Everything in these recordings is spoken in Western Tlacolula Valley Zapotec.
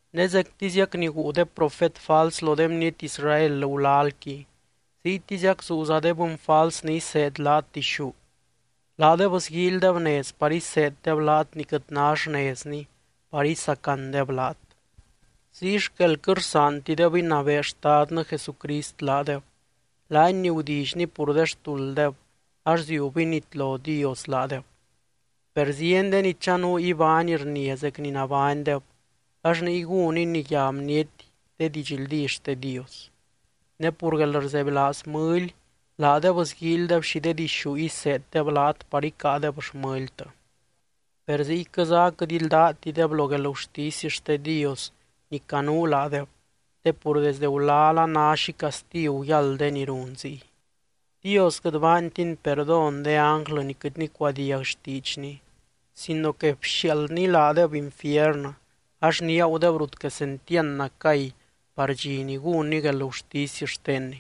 Ne zectiziac ni guu de profet fals lo de bniety Israel gulalqui, ziytiziac zuuza de bɨny fals ni iseed laat dixú. Laadeb sguíilydeb nez par iseeddeb laat ni quɨt ná xnezni par isacandeb laat. Ziy xquel quɨt rsaantideb inabee Xtadnɨ Jesucrist laadeb, laany ni gudillyny pur de xtulddeb, ax ziub initlo Dios laadeb. Per zieny de ni chanuu ibány rnia zec ni nabánydeb, ax niy gún iniyá bniety de didxldí xte Dios. Ne pur guelrzebylaaz mɨly, laadeb sguíilydeb xi de dixú iseeddeb laat par icáadeb xmɨltɨ. Per ziyquɨza aquɨt ldátideb lo guelgurtisy xte Dios ni canuu laadeb te pur desde gulal a ná xi castigu yáld de ni run ziy. Dios quɨt baantiny perdón de ánglɨ ni quɨt nicuadiag xtiidxny sino que bxiaaldny laadeb infiernɨ, ax niagudeb rut quesentiand nacay par dxi ni gúnny guelgurtisy xtenny.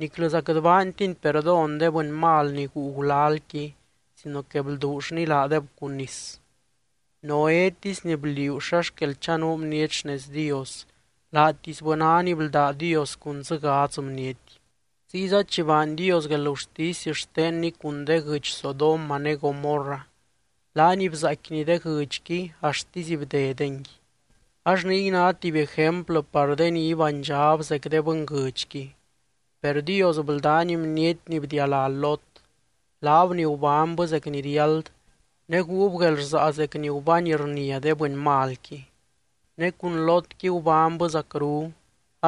Niclɨza quɨt baantiny perdón de bɨny mal ni guu gulalqui sino que blduullny laadeb cun nis. Noétisy ni bliuu xa xquel chanuu bniety xnez Dios, laatisbɨ ná ni bldá Dios cun dzɨ gadz bniety. Ziyza chi baany Dios guelgurtisy xtenny cun de guɨdx Sodoma ne Gomorra, laany bzaaicquiny de guɨdxqui axtisy bdedengui. Ax niy ná tuby ejemplɨ par de ni ibánydxab zec de bɨnguɨdxqui. Per Dios bldány bniety ni bdialá Lot, laab ni gubánybɨ zec ni riáld ne guub guelrsaa zec ni gubány rnia de bɨny malqui. (Ne cun Lotqui gubánybɨ zacru,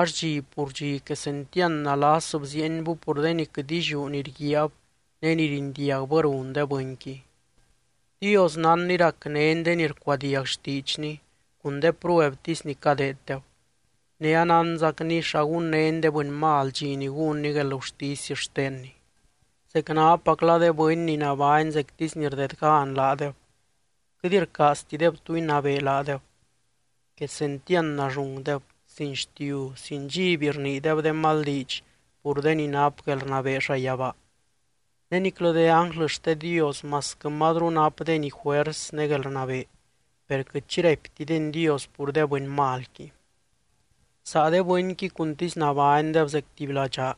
ax dxi pur dxi quesentiand nalas bziienbɨ pur de ni quɨt illiú ni rguiaab ne rindiagbɨ run de bɨnqui.) Dios nánny racnény de ni rcuadiag xtiidxny cun de pruebtisy ni cadeeddeb. Ne anánzacny xa gunnény de bɨny mal dxi ni gúnny guelgurtisy xtenny. Zecnapacla de bɨny ni nabány zectisy ni rdedgan laadeb, quɨt rcaaztideb tu inabee laadeb. Quesentiand nallungdeb, sin xtiu, sin dxiby rniideb de mal diidx pur de ni nap guelrnabee llayabaa. Ne niclɨ de ánglɨ xte Dios masquɨ mazru napdeny juers ne guelrnabee, per quɨt xi raiptideny Dios pur de bɨny malqui. Saa de bɨnqui cuntisy nabánydeb zec tuby ladxaa,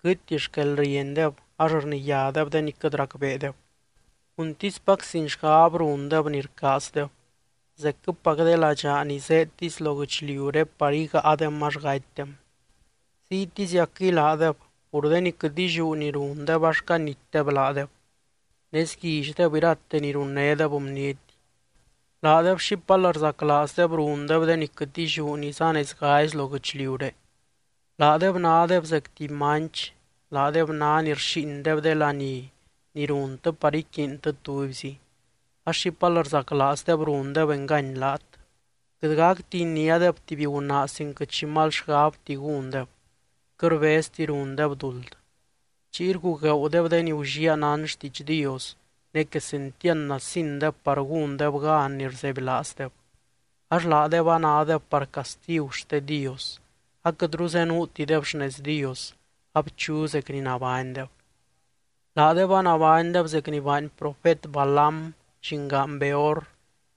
quɨtti xquelriendeb ax rniyádeb de ni quɨt racbeedeb. Cuntispac sin xgab rundeb ni rcaazdeb, zecquɨpac de ladxaa ni zéedtisy lo guɨchliuré par igáadem ax gatydem. Ziytiziacquɨy laadeb, pur de ni quɨt illiú ni rundeb ax canitdeb laadeb. Ne sguillydeb irate ni runnédeb de bniety. Laadeb xipal rzaclaazdeb rundeb de ni quɨt illiú ni zanezgazi lo guɨchliuré. Laadeb nádeb zec tuby manch, laadeb ná ni rxíindeb de laní ni runtɨ par iquiintɨ tubyzi, ax xipal rzaclaazdeb rundeb engany laat. Quɨt gacti iniádeb tuby gunaa sin quɨt xi mal xgabti gúndeb, quɨt rbezti rundeb duld. Chiy rgugueeudeb de ni gulliaa nán xtiidx Dios, ne quesentiand nasindeb par gúndeb gan ni rzebylaazdeb, ax laadeb anádeb par castigu xte Dios, aquɨtru zenuutideb xnez Dios, abchu zec ni nabánydeb. Laadeb anabánydeb zec ni baany profet Balaam llingaan Beor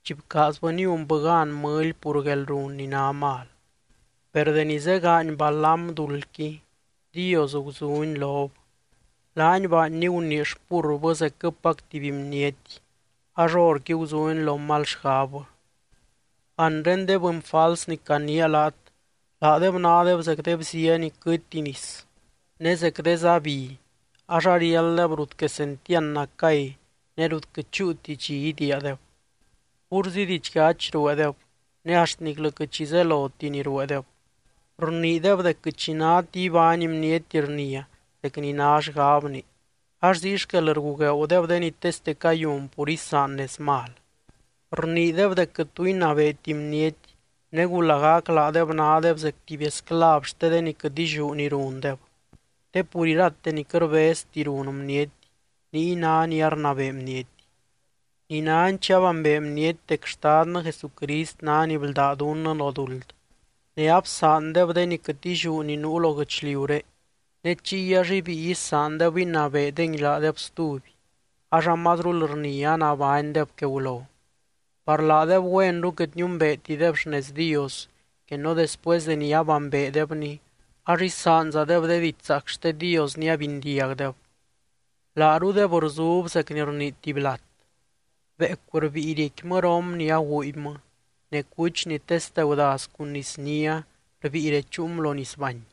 chi bcaazbɨ niunbɨ gan mɨly pur guelrun ni ná mal. Per deni zegaany Balaam duldqui, Dios guzuny lob. Laany baanny gunii xpurrbɨ zecquɨpac tuby bniety ax horqui guzuny lo mal xgabbɨ. Anre de bɨny fals ni caniia laat, laadeb nádeb zec de bzia ni quɨtti nis ne zec de zá bi ax ariálddeb rut quesentiand nacay ne rut quɨt chúuti dxi idiiadeb. Púrzi didxyachy rueedeb ne axt niclɨ quɨt xi zeloti ni rueedeb. Rniideb dec quɨt xi náti ibány bniety rnia zec ni ná xgabni ax ziy xquel rgugueeudeb de ni teste cayun pur isaan nez mal. Rniideb dec quɨt tu inabeeti bniety, negu lagac laadeb nádeb zec tuby esclav xte de ni quɨt illiú ni rundeb. Te pur irate ni quɨt rbezti run bniety, niy ná ni arnabee bniety. Ninani chi abambee bniety dec Xtadnɨ Jesucrist ná ni bldá dunnɨ lo duld, ne absaandeb de ni quɨt illiú ni nuu lo guɨchliuré, ne chiy ax ibíi isaandeb inabeedengui laadeb stuby, ax amazrul rnia anabánydeb que gulo. Par laadeb güenru quɨt niumbeetideb xnez Dios que no después deni abambeedebny ax isaanzadeb de diidx zaac xte Dios ni abindiagdeb. Laarudeb rzub zec ni rnii tuby lat: “Beecu rbíi riecquimɨ rom ni aguubymɨ ne cuch ni teste gudaz cun nisnia, rbíi rechuum lo nisbany.”